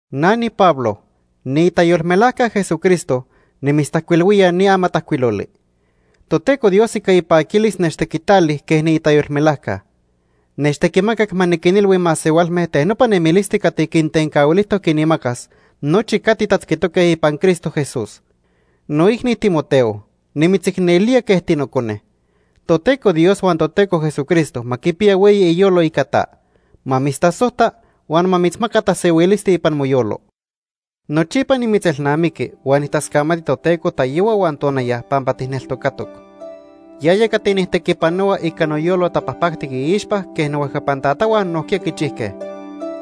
Na niPablo, niitayolmelajca Jesucristo nimitztajcuilhuía ni amatajcuiloli. Toteco Dios ica ipaquilis nechtequitali quej niitayolmelajca. Nechtequimacac ma niquinilhui masehualme ten nopa nemilisti cati quitencahuilijtoc quinmacas nochi cati tatzquitoque ipan Cristo Jesús. Noicni Timoteo, nimitzicnelía quej tinocone. Toteco Dios huan Toteco Jesucristo ma quipiya hueyi iyolo ica ta. Ma mitztasojta huan ma mitzmaca tasehuilisti ipan moyolo. Nochipa nimitzelnamiqui huan nijtascamati Toteco tayohua huan tonaya pampa tijneltocatoc. Yaya cati nijtequipanohua ica noyolo tapajpactic iixpa quej nohuejcapan tatahua nojquiya quichijque.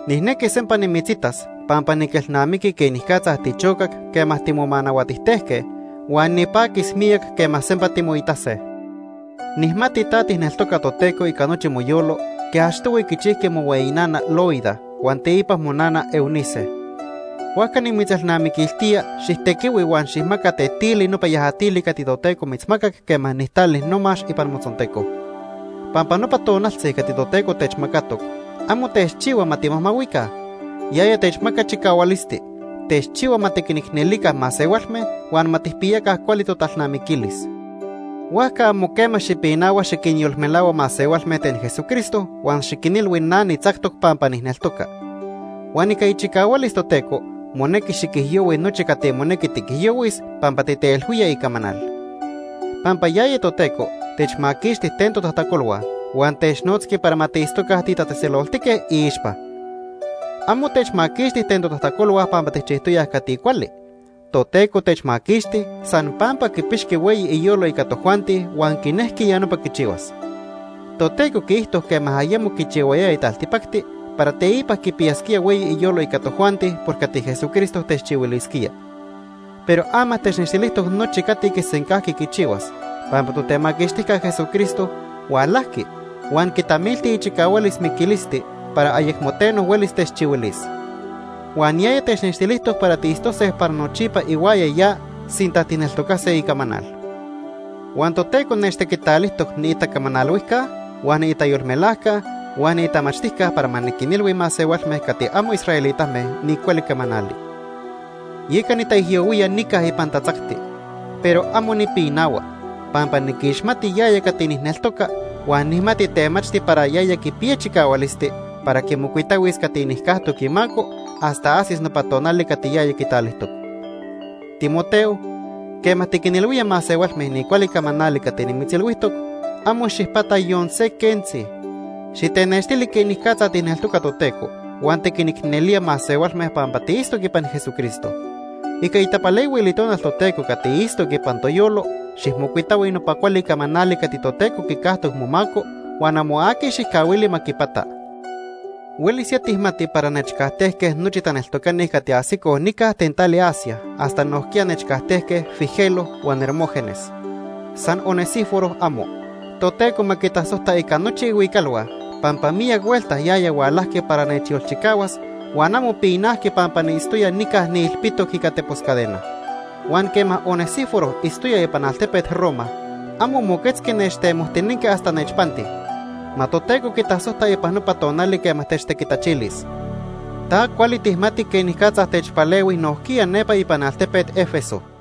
Nijnequi sempa nimitzitas pampa niquelnamiqui quenicatza tichocac quema timonahuatijtejque huan nipaquis miyac quema sempa timoitase. Nijmati ta tijneltoca Toteco ica nochi moyolo quej achtohui quichijqui mohueyi nana, Loida, huan teipa monana, Eunice. Huajca nimitzelnamiquiltía xijtequihui huan xijmaca tetili nopa yajatili cati Toteco mitzmacac quema nijtali nomax ipan motzonteco. Pampa nopa tonaltzi cati Toteco techmacatoc amo techchihua ma timajmahuica. Yaya techmaca chicahualisti. Techchihua ma tiquinicnelica masehualme huan ma tijpiyaca cuali totalnamiquilis. Huajca amo quema xipinahua xiquinyolmelahua masehualme ten Jesucristo huan xiquinilhui na nitzactoc pampa nijneltoca. Huan ica ichicahualis Toteco monequi xiquijyohui nochi cati monequi tiquijyohuis pampa titeilhuía icamanal. Pampa yaya Toteco techmaquixti ten totajtacolhua huan technotzqui para ma tiitztoca titatzejtzeloltique iixpa. Amo techmaquixti ten totajtacolhua pampa tijchijtoyaj cati cuali. Toteco techmaquixti san pampa quipixqui hueyi iyolo ica tojuanti huan quinejqui ya nopa quichihuas. Toteco quiijto quema ayemo quichihuayaya taltipacti para teipa quipiyasquía hueyi iyolo ica tojuanti por cati Jesucristo techchihuilisquía. Pero ama technextilijtoc nochi cati quisencajqui quichihuas pampa Totemaquixtijca Jesucristo hualajqui huan quitamilti ichicahualis miquilisti para ayecmo teno huelis techchihuilis. Huan yaya technextilijtoc para tiitztose para nochipa ihuaya ya sinta tijneltocase icamanal. Huan Toteco nechtequitalijtoc niitacamanalhuijca huan niitayolmelajca huan niitamachtijca para ma niquinilhui masehualme cati amo israelitame ni cuali camanali. Yeca nitaijyohuía nica ipan tatzacti. Pero amo nipinahua, pampa niquixmati yaya cati nijneltoca huan nijmati temachti para yaya quipiya chicahualisti para quimocuitahuis cati nijcajtoc imaco hasta ajsis nopa tonali cati ya quitalijtoc. Timoteo, quema tiquinilhuía masehualme ni cuali camanali cati nimitzilhuijtoc, amo xijpata yon se quentzi. Xitenextili quenicatza tijneltoca Toteco huan tiquinicnelía masehualme pampa tiitztoc ipan Jesucristo. Ica itapalehuil Itonal Toteco cati itztoc ipan toyolo, xijmocuitahui nopa cuali camanali cati Toteco quicajtoc momaco, huan amo aqui xijcahuili ma quipata. Huelis ya tijmati para nechcajtejque nochi taneltocani cati ajsicoj nica ten tali Asia, hasta nojquiya nechcajtejque Figelo huan Hermógenes. San Onesíforo, amo. Toteco ma quitasojta ica nochi ihuicalhua pampa miyac huelta yaya hualajqui para nechyolchicahuas, huan amo pinajqui pampa niitztoya nica niilpitoc ica tepos cadena. Huan quema Onesíforo itztoya ipan altepet Roma, amo moquetzqui nechtemojtinenqui hasta nechpanti. Ma Toteco quitasojta ipan nopa tonali quema techtequitachilis. Ta cuali tijmati quenicatza techpalehui nojquiya nepa ipan altepet Éfeso.